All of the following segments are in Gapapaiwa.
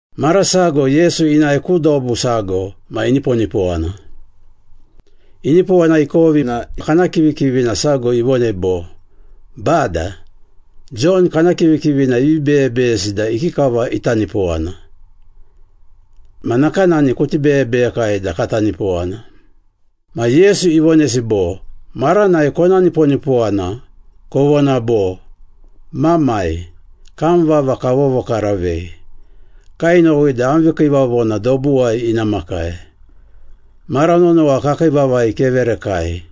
Mara sago Yesu inae ku dobu sago ma iniponipowana. Inipowana ikovi na kana kivikivina sago ivonei bo, “Bada, Jon kana kivikivina ivi beyebeyesi da ikikava ita nipowana. Ma nakanani kuti beyebeyekai da kata nipowana.” Ma Yesu ivonesi bo, “Maranai kona niponipowana, kovona bo, ‘Mamai, Kam vava kavovokaravei. Kainowi da am vikiivavona dobuwai ina makai. Mara nonowa kakii vavai keverekai.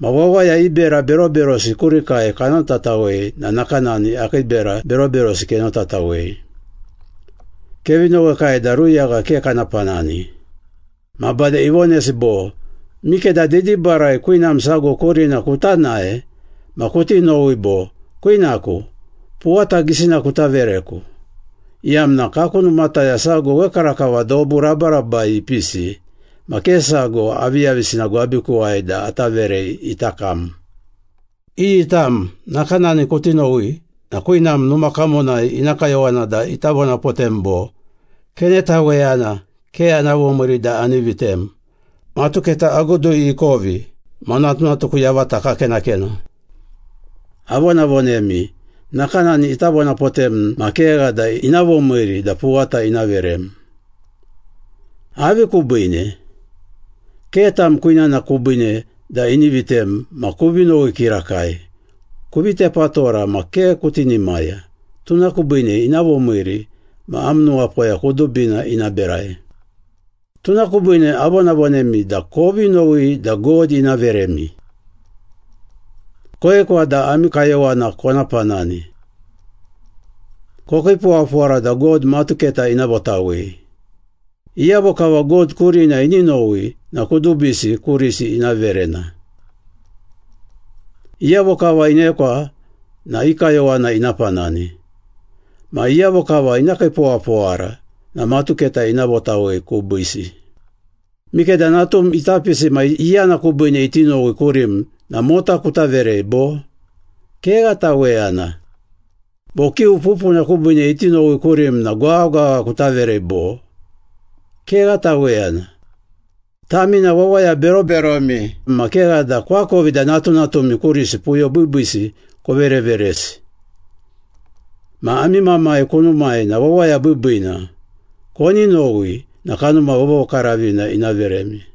Ma wawaya i bera beroberosi kurikai kanotatawei na nakanani akii bera beroberosi kenotatawei. Kevi nowekai da ruyagha ke kana panani.’” Ma bade ivonesi bo, “Mikeda didibarai kwinam sago kurina kuta nae ma kuti nowi bo, ‘Kwinaku, puwata gisina kuta vereku iyamna kaku numataya sago wekarakava dobu rabarabai ipisi ma ke sago aviyavisina gwabikuwai da ata verei ita kam.’ Iyi tam nakanani kuti nowi na kwinam numa kamonai ina kayowana da ita vonapotem bo, ‘Kenetaweyana! Ke ana vomiiri da ani vitem. Matuketa agudui ikovi, ma natunatuku yavata kakenakena.’ Avonavonemi, nakanani ita vonapotem ma kegha da ina vomiiri da puwata ina verem. Avi kubiine? Ke tam kwinana kubiine da ini vitem ma kuvi nowi kirakai, kuvi tepatora ma ke kutinimaya, tuna kubiine ina vomiiri ma am nuwapoya kudubina ina berai. Tuna kubiine avonavonemi da kovi nowi da God ina veremi. Koekwa da ami kayowana kona panani. Kokiipowapowara da God matuketa ina votawei. Iyavo kava God kurina ini nowi na kudubisi kurisi ina verena. Iyavo kava inekwa na i kayowana ina panani. Ma iyavo kava ina kiipowapowara na matuketa ina votawei kubiisi. Mikeda natum ita pisi ma iyana kubiine iti nowi kurim na mota kuta verei, bo? Kegha taweyana. Bo kiu pupuna kubiine iti nowi kurim na gwaghagwagha kuta verei, bo? Kegha taweyana. Tami na wawaya beroberomi ma kegha da koakovi da natunatumi kurisi puyo biibiisi kovereveresi. Ma ami Mamai kunumai na wawaya biibiina. Koni nowi na Kanuma Vovokaravina ina veremi.”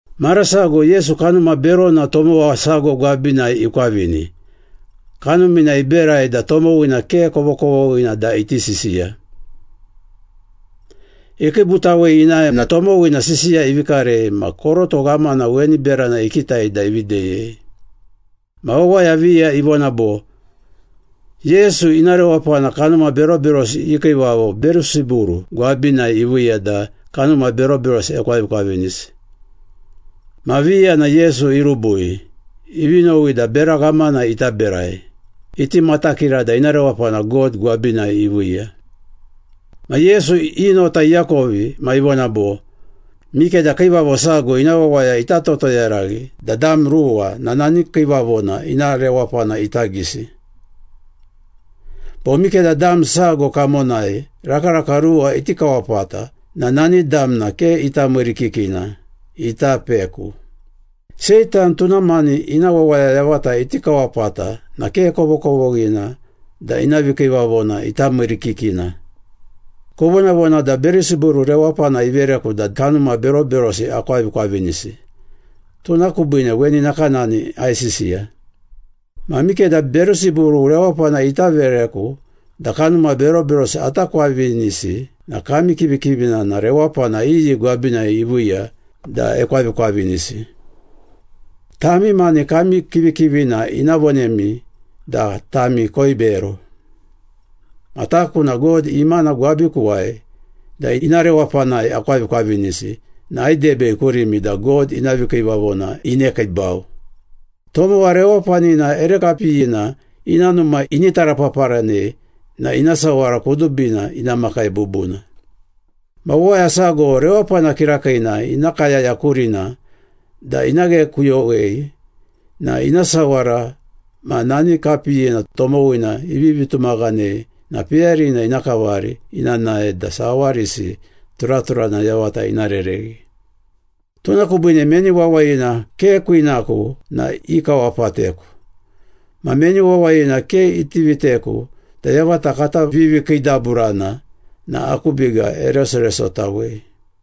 Mara sago Yesu kanuma berona tomowa sago gwabinai ikwavini, kanumina iberai da tomowina ke kovokovoghina da iti sisiya. Ikiibutawei inae na tomowina sisiya ivi karei ma koroto ghamana weni berana ikitai da ivi deyei. Ma wawaya viya ivona bo, “Yesu ina rewapana kanuma beroberosi i kiivavo Berusiburu gwabinai iviiya da kanuma beroberosi ekwavikwavinisi.” Ma viya na Yesu irubui, ivi nowi da bera ghamana ita berai, iti matakira da ina rewapana God gwabinai iviiya. Ma Yesu i nota iakovi ma ivona bo, “Mikeda kiivavo sago ina wawaya ita totoyaraghi da dam ruwa na nani kiivavona ina rewapana ita gisi. Bo mikeda dam sago kamonai rakaraka ruwa iti kawapata na nani damna ke ita miirikikina, ita peku. Seitan tuna mani ina wawaya yavata iti kawapata na ke kovokovoghina da ina vikiivavona ita miirikikina. Kovonavona da Berusiburu rewapana ivereku da kanuma beroberosi akwavikwavinisi, tuna kubiine weni nakanani aisisiya. Ma mikeda Berusiburu rewapana ita vereku da kanuma beroberosi ata kwavinisi na kami kivikivina na rewapana iyi gwabinai iviiya da ekwavikwavinisi? Tami mani kami kivikivina ina vonemi da tami koibero. Ma taku na God imana gwabikuwai da ina rewapanai akwavikwavinisi na aidebei kurimi da God ina vikiivavona inekiibau.” “Tomowa rewapanina ere kapiyina ina numa ini tarapaparanei na ina sawara kudubina ina makai bubuna. Ma wawaya sago rewapana kirakiina ina kayaya kurina da ina ghekuyowei na ina sawara ma nani kapiyina tomowina ivivi tumaghanei na peyarina ina kavari ina nae da sawarisi turaturana yavata ina rereghi.” “Tuna kubiine meni wawayina ke kwinaku na ikawapateku. Ma meni wawayina ke iti viteku da yavata kata vivikiidaburana na aku biga eresoresotawei.”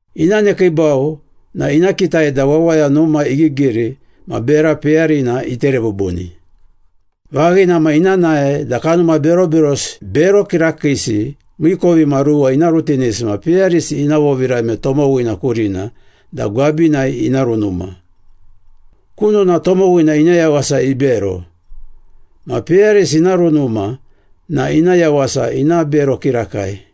Ina nekiibau na ina kitai da wawaya numa igigiri ma bera peyarina itere bubuni. Vaghina ma ina nae da kanuma beroberosi bero kirakiisi miikovimaruwa ina rutinisi ma peyarisi ina vovirame tomowina kurina da gwabinai ina runuma. Kunona tomowina ina yawasa ibero. Ma peyarisi ina runuma na ina yawasa ina bero kirakai.”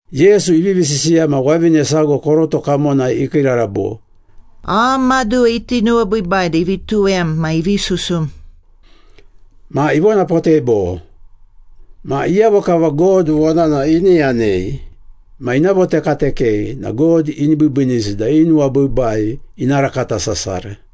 Yesu ivivi sisiya ma wavine sago koroto kamonai ikiirara bo, “Am maduwa iti nuwabiibai da ivi tuwem ma ivi susum.” Ma ivonapotei bo, “Ma iyavo kava God vonana ini yanei ma ina votekatekei na God ini biibiinisi da i nuwabiibai ina rakata sasara.”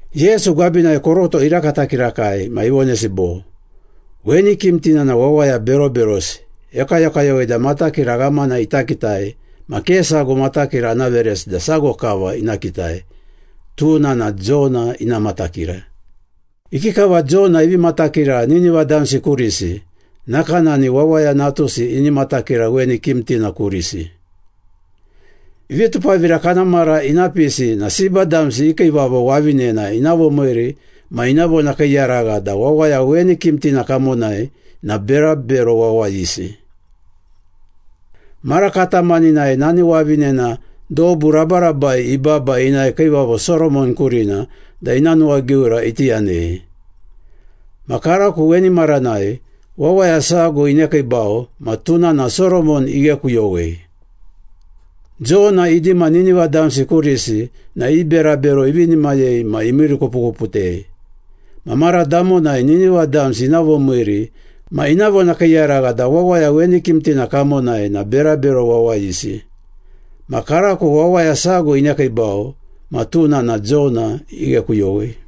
Yesu gwabinai koroto irakata kirakai ma ivonesi bo, “Weni kimtina na wawaya beroberosi, ekayokayowei da matakira ghamana ita kitai ma ke sago matakira ana veresi da sago kava ina kitai, tuna na Jona ina matakira. Ikikava Jona ivi matakira Nineva damsi kurisi, nakanani Wawaya Natusi ini matakira weni kimtina kurisi. Vitupavira kana mara ina pisi na Seba damsi i kiivavo wavinena ina vomiiri ma ina vonakiiyaragha da wawaya weni kimtina kamonai na berabero wawayisi. Mara katamaninai nani wavinena dobu rabarabai ibaba inae Kiivavo Soromon kurina da ina nuwagiura iti yanei. Ma karako weni maranai, wawaya sago inekiibau ma tuna na Soromon ighekuyowei. Jona idima Nineva damsi kurisi na i berabero ivinimayei ma imiirikupukuputei. Ma mara damonai Nineva damsi ina vomiiri ma ina vonakiiyaragha da wawaya weni kimtina kamonai na berabero wawayisi. Ma karako wawaya sago inekiibau ma tuna na Jona ighekuyowei.”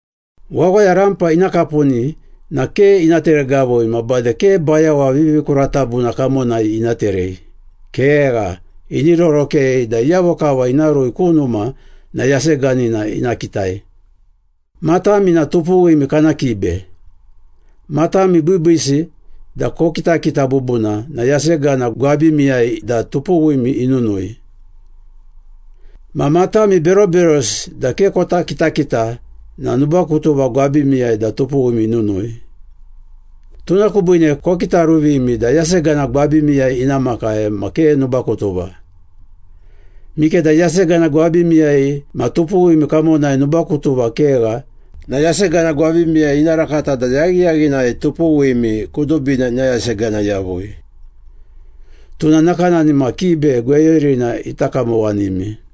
“Wawaya rampa ina kapuni na ke ina teregavui ma bade ke bayawa vivikuratabuna kamonai ina terei. Kegha, ini rorokei da iyavo kava ina rui ku numa na yaseganina ina kitai. Matami na tupuwimi kana kibe. Matami biibiisi da kokitakita bubuna na yasegana gwabimiyai da tupuwimi inunui. Ma matami beroberosi da ke kota kitakita na nubakutuva gwabimiyai da tupuwimi inunui. Tuna kubiine kokitaruvimi da yasegana gwabimiyai ina makai ma ke nubakutuva. Mikeda yasegana gwabimiyai ma tupuwim kamonai nubakutuva kegha na yasegana gwabimiyai ina rakata da yaghiyaghinai tupuwimi kudubina ina yasegana yavui. Tuna nakanani ma kibe gweyurina ita kamowanimi.”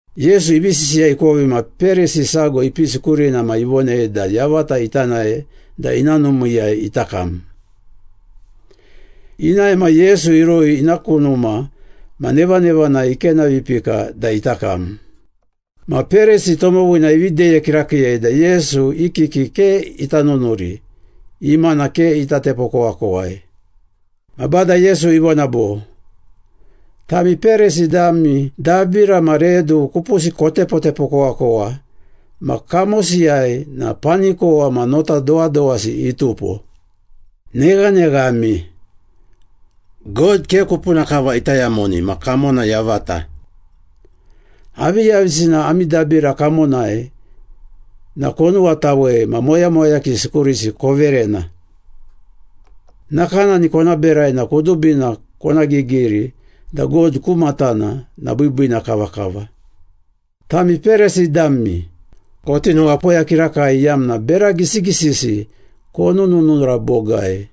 Yesu ivi sisiya ikovi ma Perisi sago ipisi kurina ma ivonei da yavata ita nae da ina numiiyai ita kam. Inae ma Yesu irui ina ku numa ma nevanevanai ikenavipika da ita kam. Ma Perisi tomowina ivi deye kirakiiyei da Yesu i kiki ke ita nunuri, imana ke ita tepokowakowai. Ma Bada Yesu ivona bo, “Tami Perisi dami dabira ma redu kupusi kotepotepokowakowa, ma kamosiyai na panikowa ma nota dowadowasi itupo. Neghaneghami! God ke kupuna kava ita yamoni ma kamona yavata. Aviyavisina ami dabira kamonai na konuwatawei ma moyamoyakisi kurisi koverena. Nakanani kona berai na kudubina kona gigiri da God ku matana na biibiina kavakava.” “Tami Perisi dami, koti nuwapoya kirakai iyamna bera gisigisisi konununura bogai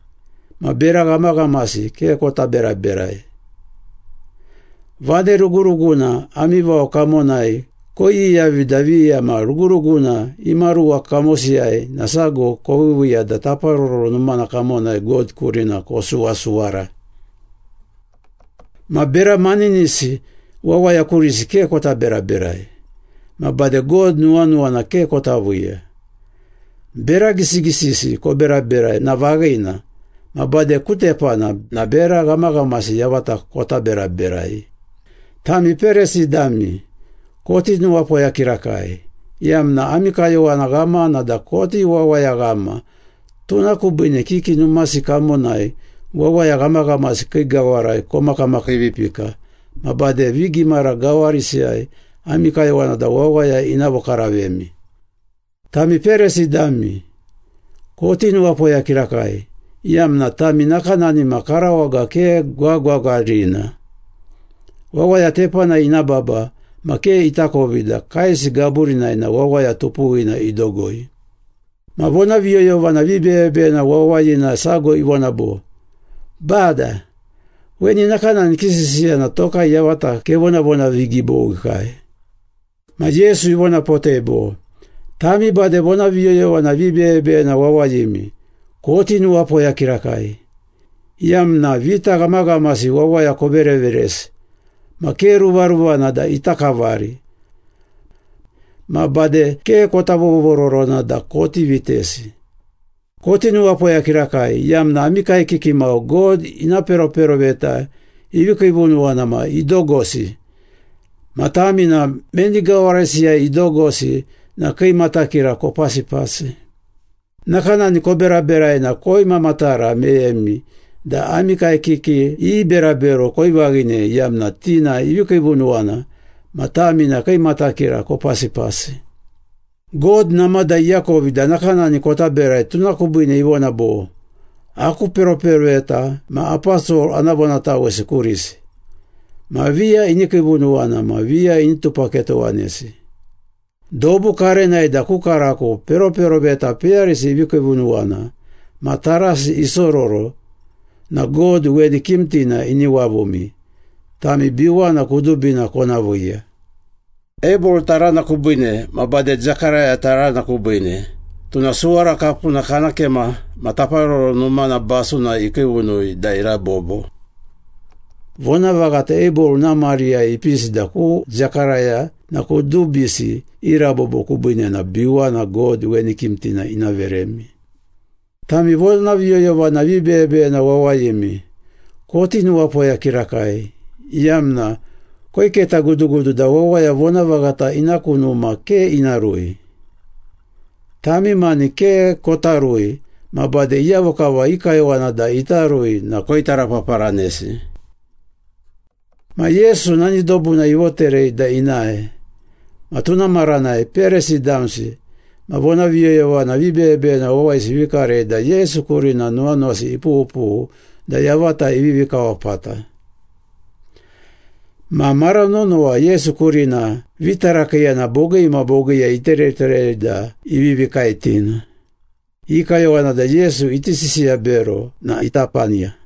ma bera ghamaghamasi ke kota beraberai! Vane ruguruguna ami vao kamonai koiyiyavi da viya ma ruguruguna imaruwa kamosiyai na sago koviiviiya da Taparoro Numana kamonai God kurina kosuwasuwara. Ma bera maninisi wawaya kurisi ke kota beraberai, ma bade God nuwanuwana ke kota viiya. Bera gisigisisi koberaberai na vaghina, ma bade ku tepana na bera ghamaghamasi yavata kota beraberai.” “Tami Perisi dami, koti nuwapoya kirakai, iyamna ami kayowana ghamana da koti wawayaghama, tuna kubiine kiki numasi kamonai wawaya ghamaghamasi kii gawarai komakamakiivipika ma bade vigimara gawarisiyai ami kayowana da wawaya ina vokaravemi. Tami Perisi dami, koti nuwapoya kirakai, iyamna tami nakanani ma karawaga ke gwagwagwarina. Wawaya tepanai ina baba ma ke itakovi da kaesi gaburinai na wawaya tupuwina idogoi.” Ma vonaviyoyovana vibeyebeyena wawayina sago ivona bo, “Bada, weni nakanani kisisiya na tokai yavata kevonavonavigibowikai.” Ma Yesu ivonapotei bo, “Tami bade vonaviyoyovana vibeyebeyena wawayimi, koti nuwapoya kirakai, iyamna vita ghamaghamasi wawaya kovereveresi ma ke ruvaruvana da ita kavari. Ma bade ke kota vovororona da koti vitesi. Koti nuwapoya kirakai, iyamna ami kaekiki mau God ina peroperoveta ivi kiivunuwana ma idogosi. Ma tami na meni gawarisiyai idogosi na kii matakira kopasipasi. Nakanani koberaberai na koimamatara meyemi da ami kaekiki i berabero koivaghinei iyamna ti na ivi kiivunuwana ma tami na kii matakira kopasipasi. God namada iakovi da nakanani kota berai tuna kubiine ivona bo, ‘Aku peroperoveta ma aposol ana vonatawesi kurisi. Ma viya ini kiivunuwana ma viya ini tupaketowanesi.’ Dobu karenai da ku karako peroperoveta peyarisi ivi kiivunuwana ma tarasi isororo na God weni kimtina ini wavumi, tami biwana kudubina kona viiya. Abel tarana kubiine ma bade Zekaraya tarana kubiine, tuna suwara kapuna kana kema ma Taparoro Numana basunai ikiivunui da irabobo. Vonavaghata Abel ina mariyai ipisi da ku Zekaraya na kudubisi i rabobo kubiine na biwana God weni kimtina ina veremi.” “Tami vonaviyoyovana vibeyebeyena wawayimi, koti nuwapoya kirakai, iyamna koiketagudugudu da wawaya vonavaghata ina ku numa ke ina rui. Tami mani ke kota rui ma bade iyavo kava i kayowana da ita rui na koitarapaparanesi.” Ma Yesu nani dobuna ivoterei da inae. Ma tuna maranai Perisi damsi ma vonaviyoyovana vibeyebeyena wawayisi ivi karei da Yesu kurina nuwanuwasi ipughupughu da yavata ivivi kawapata. Ma mara nonowa Yesu kurina vitarakiiyana bogii ma bogiiyai itereterei da ivivi kaetina. I kayowana da Yesu iti sisiya bero na ita paniya.